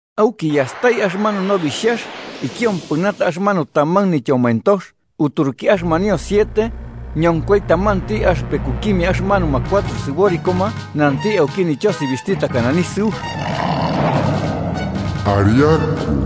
Auki yastai axɨmanu Nobixhax ikiompɨnata axɨmanu taman nityomoentox uturuki axɨmanio siete, ñonkoi tamanti axɨpekukimia axɨmanuma cuatro sɨborikoma nanti auki nityosibixhti takana nisɨux: “¡Ariaku!”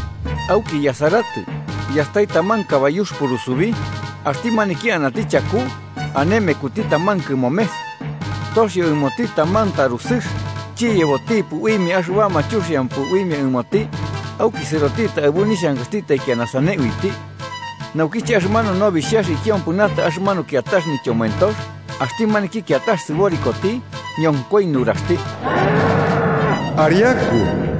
Auki yasaratɨ, yastai taman kabayux purusubi, axti maniki anati chaku ane mekuti taman kɨmomes. Toxio ɨmoti taman tarusɨx, chiyebotipɨ uimia axɨbama chuxiampɨ uimia ɨmoti, auki sɨrotitɨ aɨbu nixhankaxti taikiana sane uiti. Naukiche axɨmanu Nobixhax ikiompɨnata axɨmanu kiatax nityomoentox, axti maniki kiatax sɨborikoti ñonkoi nuraxti: “¡Ariaku!”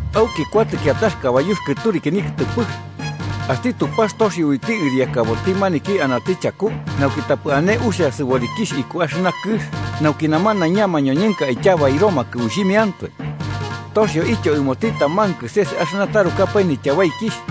Auki kuatɨ kiatax kabayux kɨturiki nikɨtɨpɨx. Axti Tupax toxio uiti ɨriakaboti maniki anati chaku nauki tapɨ ane uxia sɨborikixh iku axɨna kɨx nauki namanaiña mañoñɨnka aityabairomakɨ uixhimiantoe. Toxioityo ɨmoti taman kɨses axɨna tarukapae nityabaikixh.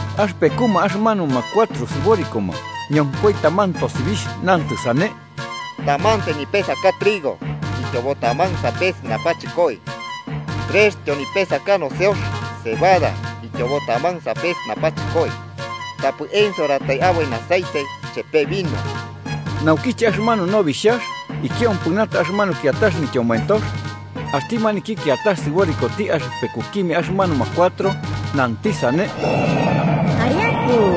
Axɨpekuma axɨmanuma cuatro sɨborikoma ñonkoi taman tosibixh nantɨ sane: “Tamantai nipesakax trigo ityobo taman sapes napachɨkoi, trextyo nipesakax noseox (cebada) ityobo taman sapes napachɨkoi. Tapɨ ensoratai aboi aceite chepe vino.” Naukiche axɨmanu Nobixhax ikiompɨnata axɨmanu kiatax nityomoentox, axti maniki kiatax sɨborikoti axɨpekukimia axɨmanuma cuatro nanti sane: “¡Ariaku!”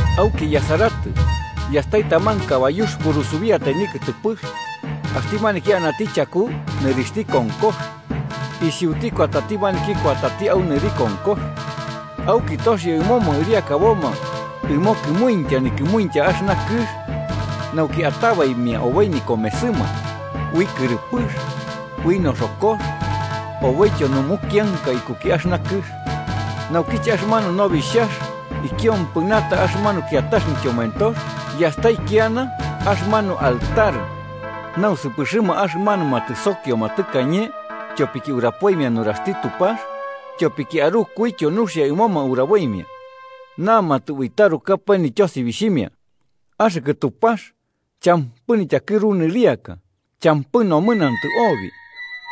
Auki yasaratɨ, yastai taman kabayux, purusubiatai nikɨtɨpɨx, axti maniki anati chaku nɨrixhti konkox. Isiuti kuatati maniki kuatati au nɨri konkox, auki toxio ɨmoma ɨriakaboma ɨmo kɨmuintya nikɨmuintya axɨna kɨx, nauki atabaimia oboi nikomesɨma, ui kɨrɨpɨx, ui noxokox, oboityo numukianka ikuki axɨna kɨx. Naukiche axɨmanu Nobixhax ikiompɨnata axɨmanu kiatax nityomoentox, yastai kiana axɨmanu altar nausɨpɨxɨma axɨmanuma tɨsokioma tɨkañe tyopiki urapoimia nuraxti Tupax tyopiki arukuityo nuxia ɨmoma uraboimia. Namatɨ ui tarukapae nityosibixhimia: “Axɨkɨ Tupax champɨ nityakɨru nɨriaka, champɨ nomɨnantɨ obi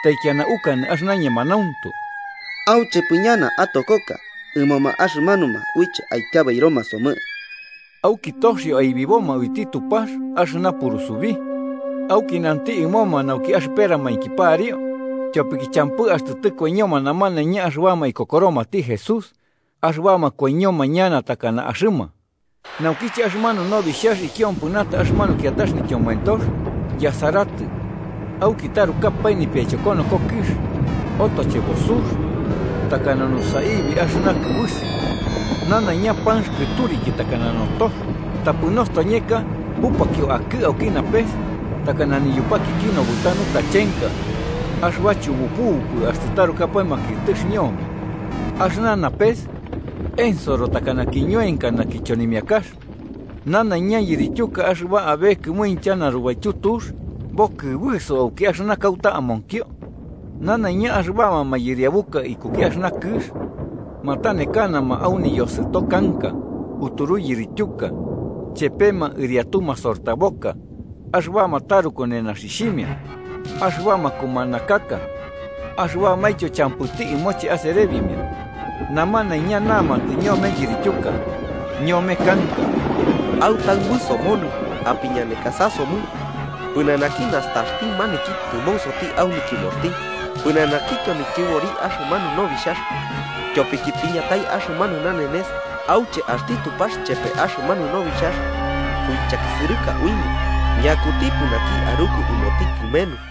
taikiana ukanɨ axɨna ñemanauntu. ¿Auchepɨ ñana atokoka ɨmoma axɨmanuma uiche aityabairoma somɨ?” Auki toxio aibiboma uiti Tupax axɨna purusubi, auki nanti ɨmoma nauki axɨperamainki pariu, tyopiki champɨ axtɨ tɨkoiñoma namanaiña axɨbama ikokoromati Jesús axɨbama koiñoma ñana takana axɨma. Naukiche axɨmanu Nobixhax ikiompɨnata axɨmanu kiatax nityomoentox, yasaratɨ, auki tarukapae nipiaichokonoko kɨx. Otochebo sux, takana nusaibi axɨna kɨbɨsi. Nanaiña panx kɨturiki takana notox, tapɨ nostoñeka bupakio akɨ auki napes, takana niyupakiki nobɨta nutachenka axɨba chupubupɨ axtɨ tarukapae makiɨtɨx ñome. Axɨna napes ensoro takana kiñoenkana kichonimiakax, nanaiña yirityuka axɨba abe kɨmuintya narubaityu tux bokɨbɨso auki axɨna kauta amonkio. Nanaiña axɨbama mayɨriabuka ikuki axɨna kɨx matanekanama au niyosɨto kanka uturu yirityuka, chepema ɨriatu masortaboka, axɨbama taruku nenaxixhimia, axɨbama kumanakaka axɨbamaintyo champɨti ɨmoche aserebimia. Namanaiña namatɨ ñome yirityuka, ñome kanka: “¡Autaɨbɨ somonɨ apiñanekasa somɨ pɨnanaki nastaxti maniki tɨmonsoti au nityɨmoxti, pɨnanakityo nityɨbori axɨmanu Nobixhax! Tyopiki tiñatai axɨmanu nanenes auche axti Tupax chepe axɨmanu Nobixhax suichakisɨrɨka uimia, ¿ñakutipɨ naki aruku ɨmoti kɨmenu?”